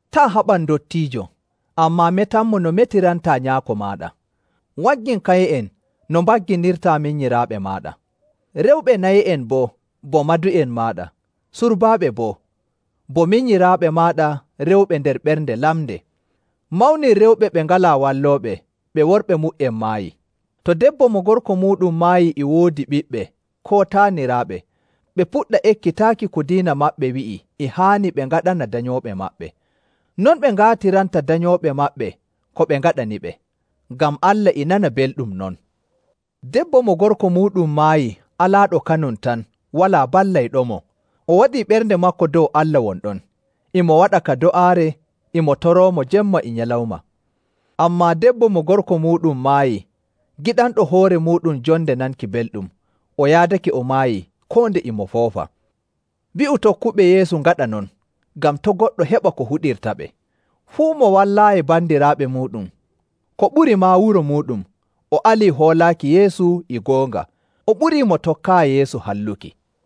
Taa' haɓan ndottiijo, ammaa metanmo no metirantaa nyaako maaɗa. Waggin kaye'en no mbagginirtaa minyiraaɓe maaɗa, rewɓe naye'en boo, bo madu'en maaɗa, surbaaɓe boo, bo minyiraaɓe maaɗa rewɓe nder ɓernde lamnde. Mawnin rewɓe ɓe ngalaa wallooɓe ɓe worɓe mu''en maayi. To debbo mo gorko muuɗum maayi e woodi ɓiɓɓe koo taaniraaɓe, ɓe puɗɗa ekkitaaki ko diina maɓɓe wi'i e haani ɓe ngaɗana danyooɓe maɓɓe, non ɓe ngaatiranta danyooɓe maɓɓe ko ɓe ngaɗaniɓe, ngam Allah e nana belɗum non. Debbo mo gorko muuɗum maayi alaaɗo kanum tan walaa ballayɗomo, o waɗii ɓernde maako dow Allah won ɗon, e mo waɗa ka do'aare e mo toroomo jemma e nyalawma. Ammaa debbo mo gorko muuɗum maayi giɗanɗo hoore muuɗum jonde nanki belɗum, o yaadake o maayii koo nde e mo foofa. Wi'u tokkuɓe Yeesu ngaɗa non, ngam to' goɗɗo heɓa ko huɗirtaɓe. Fuu mo wallaayi bandiraaɓe muuɗum, ko ɓuri maa wuro muuɗum, o alii hoolaaki Yeesu e goonga, o ɓurii mo tokkaayi Yeesu halluki.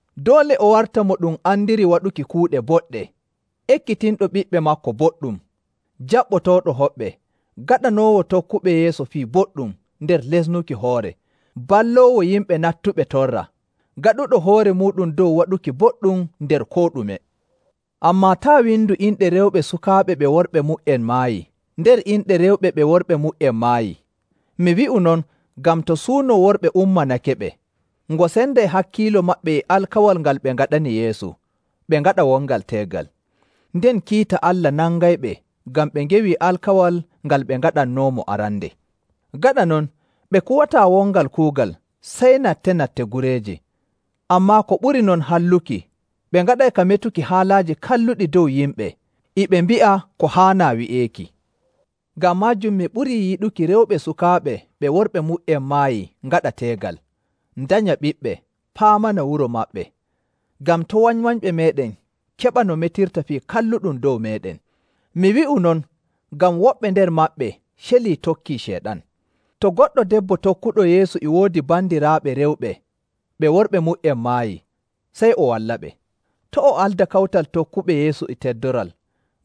Doole o warta mo ɗum andiri waɗuki kuuɗe boɗɗe, ekkitinɗo ɓiɓɓe maako boɗɗum, jaɓɓotooɗo hoɓɓe, gaɗanoowo tokkuɓe Yeesu fii boɗɗum nder lesnuki hoore, balloowo yimɓe nattuɓe torra, gaɗuɗo hoore muuɗum dow waɗuki boɗɗum nder koo ɗume. Ammaa taa' windu inɗe rewɓe sukaaɓe ɓe worɓe mu''en maayi nder inɗe rewɓe ɓe worɓe mu''en maayi. Mi wi'u non ngam to suuno worɓe ummanakeɓe, ngo senday hakkiilo maɓɓe e alkawal ngal ɓe ngaɗani Yeesu, ɓe ngaɗa wongal teegal. Nden kiita Allah nangayɓe ngam ɓe ngewii alkawal ngal ɓe ngaɗannoomo arande. Gaɗa non, ɓe kuwataa wongal kuugal sey natte‑natte gureeje, ammaa ko ɓuri non halluki, ɓe ngaɗay ka metuki haalaaji kalluɗi dow yimɓe e ɓe mbi'a ko haanaa wi'eeki. Ngam maajum mi ɓurii yiɗuki rewɓe sukaaɓe ɓe worɓe mu''en maayi ngaɗa teegal, ndanya ɓiɓɓe, paamana wuro maɓɓe, ngam to' wanywanyɓe meeɗen keɓa no metirta fii kalluɗum dow meeɗen. Mi wi'u non ngam woɓɓe nder maɓɓe celii tokkii Ceyɗan. To goɗɗo debbo tokkuɗo Yeesu e woodi bandiraaɓe rewɓe ɓe worɓe mu''en maayi, sey o wallaɓe. To' o alda kawtal tokkuɓe Yeesu e teddoral,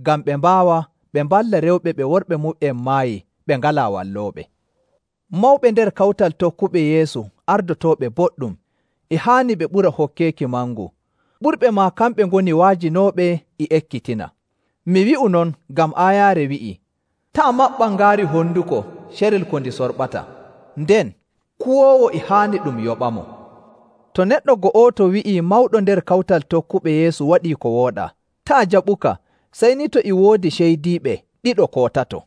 ngam ɓe mbaawa ɓe mballa rewɓe ɓe worɓe mu''en maayi ɓe ngalaa wallooɓe. Mawɓe nder kawtal tokkuɓe Yeesu ardotooɓe boɗɗum e haani ɓe ɓura hokkeeki mangu, ɓurɓe maa kamɓe ngoni wa'ajinooɓe e ekkitina. Mi wi'u non ngam aayaare wi'ii, “Taa' maɓɓan ngaari honduko carel ko ndi sorɓata,” nden, “Kuwoowo e haani ɗum yoɓamo.” To neɗɗo go'oto wi'ii mawɗo nder kawtal tokkuɓe Yeesu waɗii ko wooɗaa, taa' jaɓuka sey ni to e woodi ceydiiɓe ɗiɗo koo tato.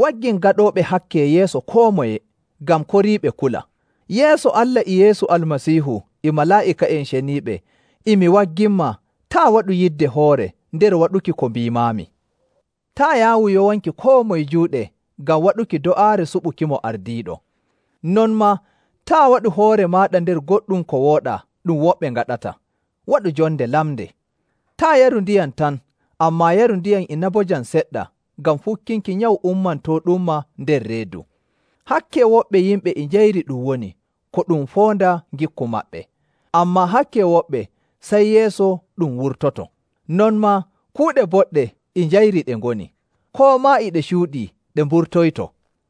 Waggin gaɗooɓe hakke yeeso koo moye, ngam koriiɓe kula. Yeeso Allah e Yeesu Almasiihu e malaa'ika'en ceniiɓe, e mi wagginmaa taa' waɗu yidde hoore nder waɗuki ko mbiimaami. Taa' yaawu yowanki koo moye juuɗe ngam waɗuki do'aare suɓukimo ardiiɗo. Non maa taa' waɗu hoore maaɗa nder goɗɗum ko wooɗaa ɗum woɓɓe ngaɗata. Waɗu jonde lamnde. Taa' yaru ndiyam tan, ammaa yaru ndiyam inabojam seɗɗa ngam fukkinki nyawu ummantooɗumma nder reedu. Hakke woɓɓe yimɓe e njayri ɗum woni ko ɗum foonda ngikku maɓɓe, ammaa hakke woɓɓe sey yeeso ɗum wurtoyto. Non maa kuuɗe boɗɗe e njayri ɗe ngoni, koo maa e ɗe cuuɗii ɗe mburtoyto.